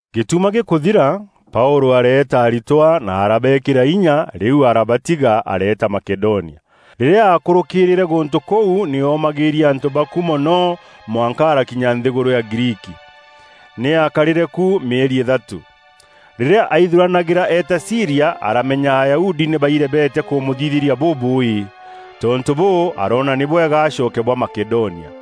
Gîtuma gîkûthira, Paûlû areeta aritwa na arabeekîra inya, rîu arabatiga areeta Makedonia. Rîrîa aakûrûkîîrîre gûntû kûu nî oomagîîria antû ba ku mono mwanka arakinya nthîgûrû ya Griiki. Nî aakarîre ku mîeri îthatû. Rîrîa aithuranagîra eeta Sîria, aramenya Ayahudi nî bairebete kûmûthithîria bûbûûî. Tontû bûû, aroona nî bwega acoke bwa Makedonia.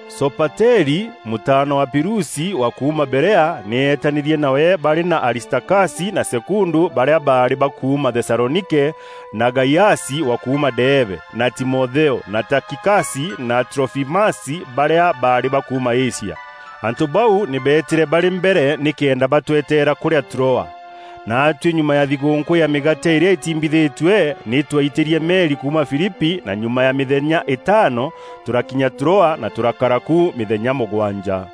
Sopateri, mûtaana wa Pirusi wa kuuma Berea, nî eetanîrie nawe barî na Aristakasi na Sekundu barîa baarî ba kuuma Thesalonike, na Gaiasi wa kuuma Deebe; na Timotheo, na Takikasi na Trofimasi barîa baarî ba kuuma Asia. Antû bau nî beetîre barî mbere nîkenda batweteera kûrîa Troa. Naatuî, nyuma ya thigûûnkû ya Mîgaate îrîa îtiimbithîtue, nî twaitîrie meri kuuma Filipi na nyuma ya mîthenya îtaano, tûrakinya Troa na tûrakara ku mîthenya mûgwanja.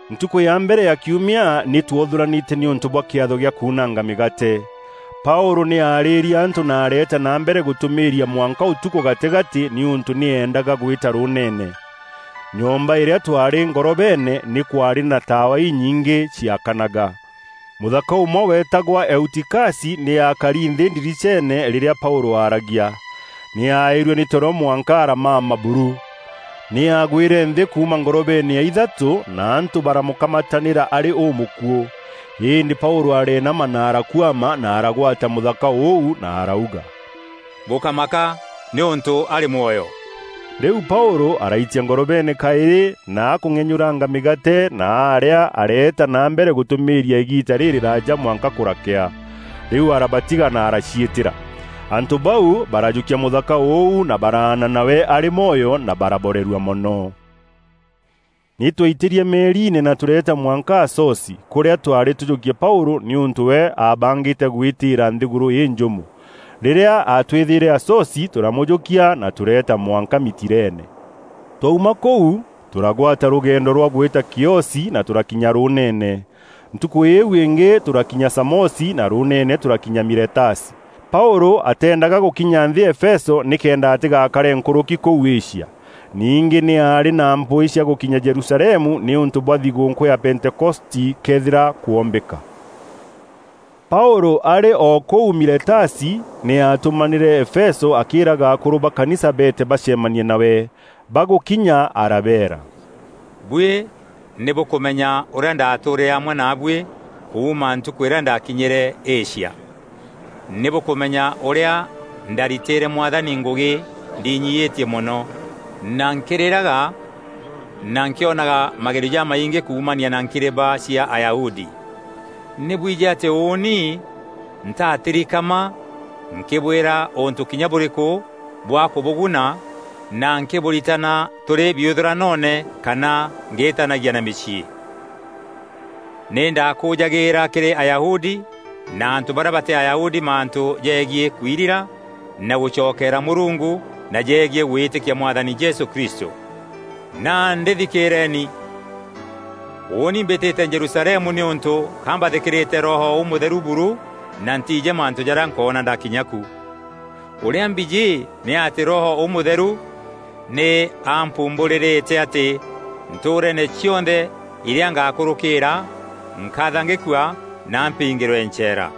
Ntukû ya mbere ya kiumia nî twothûranîte nîûntû bwa kîatho gîa kuunanga mîgaate. Paûlû nî aarîîrie antû na areeta na mbere gûtûmîîria mwanka ûtukû gatîgatî nîûntû nî eendaga gwîta rûûneene. Nyomba îrîa twaarî ngorobeene, nî kwaarî na taawa inyingî ciaakanaga. Mûthaka ûmwe weetagwa Eutikasi nî aakari nthî ndiriceene rîrîa Paûlû aaragia. Nî aaîrue nî toro mwanka aramama buru. Nî aagwîre nthî kuuma ngorobeene ya ithatû na antû baramûkamatanîra arî ûmûkuû. Îndî Paûlû areenama na arakuama na aragwata mûthaka ûu na arauga, “Bûkámaka nîûntû arî mwoyo.” Rîu Paûlû araitia ngorobeene kaîrî na akûng'enyûranga mîgaate na aarîa, areeta na mbere gûtûmîîria îgiita rîrîraaja mwanka kûrakea. Rîu araabatiga na araciîtîra. Antû bau barajûkia mûthaka ûu na baraana nawe arî mwoyo na baraborerua mono. Nî twaitîrie meeriine na tûreeta mwanka Asosi, kûrîa twaarî tûjûkie Paûlû, nîûntû we aabangîte gwîtîîra nthîgûrû înjûmo. Rîrîa aatwîthîre Asosi, tûramûjûkia na tûreeta mwanka Mitilene. Twauma kûu, tûragwata rûgendo rwa gwîta Kiosi na tûrakinya rûûneene. Ntukû îîu îngî tûrakinya Samosi na rûûneene tûrakinya Miletasi. Paûlû ateendaga gûkinya nthî Efeso nîkenda atîgaakare nkûrûki kûu Asia. Ningî nî aarî na mpwîî cia gûkinya Jerusalemu nîûntû bwa thigûûnkû ya Pentekoste këethîra kwombîka. Paûlû arî o kûu Miletasi nî aatûmanîre Efeso akîîraga akûrû ba kanisa beete bacemanie nawe. Bagûkinya arabeera, “Buî nî bûkûmenya ûrîa ndaatûûrîre amwe naabuî kuuma ntukû îrîa ndakinyîre Asia. Nî bûkûmenya ûrîa ndaaritîîre Mwathani ngûgî ndiinyiîtie mono, na nkîrîraga na nkîonaga magerio jamaingî kuumania na nkireba cia Ayahudi. Nî bwijî atî ûûni ntaatirikama nkîbwîra ûntû kinya bûrîkû bwa kûbûguna na nkîbûritana tûrî biûthûranoone kana ngîîtanagia na mîciî. Nî ndaakûûjagîîra kîrî Ayahudi na antû barîa batî Ayahudi mantû jegiî kwirira na gûcokeera Mûrungu na jegiî gwîtîkia Mwathani Jesû Kristû. Nandî thikîîreeni! Ûûni mbîtîte Jerusalemu nîûntû ka mbathîkîrîte Roho Ûmûtheru buru na ntiijî mantû jarîa nkoona ndakinya ku. Ûrîa mbijî nî atî Roho Ûmûtheru nî ampumbûrîrîte atî ntûûreene cionthe irîa ngakûrûkîîra, nkathangîkua na mpiingîrwe ncheera.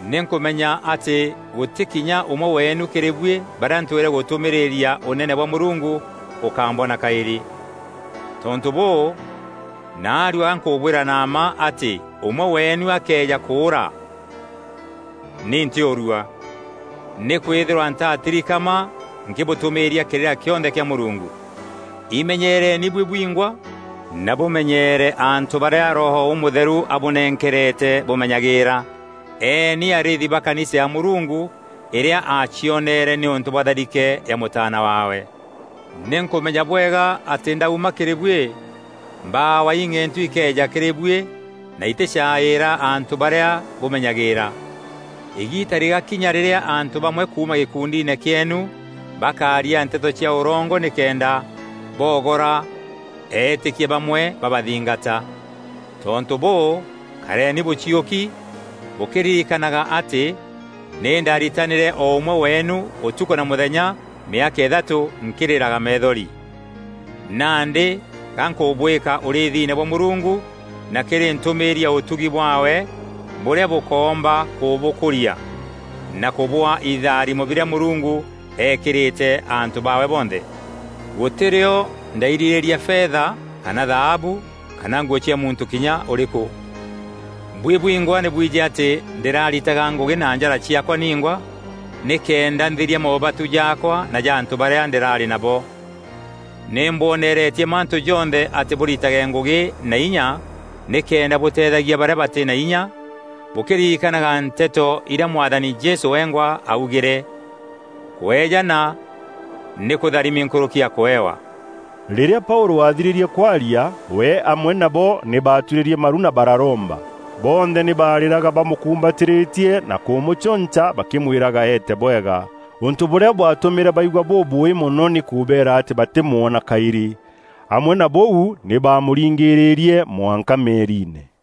“Nî nkûmenya atî gûtî kinya ûmwe weenû kîrî buî barîa ntwîre gûtûmîîrîria Ûnene bwa Mûrungu, ûkambona kaîrî. Tontû bûû, naarua ga nkûbwîra na mma atî ûmwe weenu akëeja kûûra, nî ntîûrua. Nîkwîthîrwa ntaatirikama nkîbûtûmîîria kîrîra kîonthe kîa Mûrungu. Imenyereeni buî bwingwa na bûmenyeere antû barîa Roho Ûmûtheru abûnenkerete bûmenyagîîra. Eeni arîîthi ba kanisa ya Mûrungu îrîa aacioneere nîûntû bwa tharike ya Mûtaana waawe. Nî nkûmenya bwega atî ndaauma kîrî buî, mbawa ing'entu ikeeja kîrî buî na itîcaîîra antû barîa bûmenyagîîra. Îgiita rîgaakinya rîrîa antû bamwe kuuma gîkundiine kîeenu bakaaria nteto cia ûrongo nîkenda boogora eetîkia bamwe babathingata. Tontû bûû, kareni bûciûki, bûkîririkanaga atî nî ndaritanîre o ûmwe weenu, ûtukû na mûthenya, mîaka îthatû, nkîrîraga meethori. “Nandî ga nkûbûîka ûrîîthine bwa Mûrungu na kîrî ntûmîîri ya ûtugi bwaawe, bûrîa bûkoomba kûbûkûria, na kûbûaa ithaarîmo birîa Mûrungu eekîrîte antû baawe bonthe. Gûtî rîo ndairîrîria fetha, kana thaabu, kana nguû cia muntû kinya ûrîkû. Buî bwingwa nî bwijî atî ndîraritaga ngûgî na njara ciaakwa ningwa, nîkenda nthiria moobatu jaakwa na ja antû barîa ndîraarî nabo. Nî mbwoneretie mantû jonthe atî bûritage ngûgî na inya nîkenda bûteethagia barîa batî na inya, bûkîriikanaga nteto irîa Mwathani Jesû wengwa aaugîre: ‘Kweejana nî kûtharimi nkûrûki ya kûewa.’” Rîrîa Paûlû aathirîrie kwaria, we amwe nabo nî baaturîrie maru na bararomba. Bonthe nî baarîraga bamûkumbatîrîtie na kûmûcûnca bakîmwîraga eete bwega. Ûntû bûrîa bwaatûmîre baigua bûbûûî mono nî kûbeera atî batîmwona kaîrî. Amwe na bûu, nî baamûringîrîrie mwanka meeriine.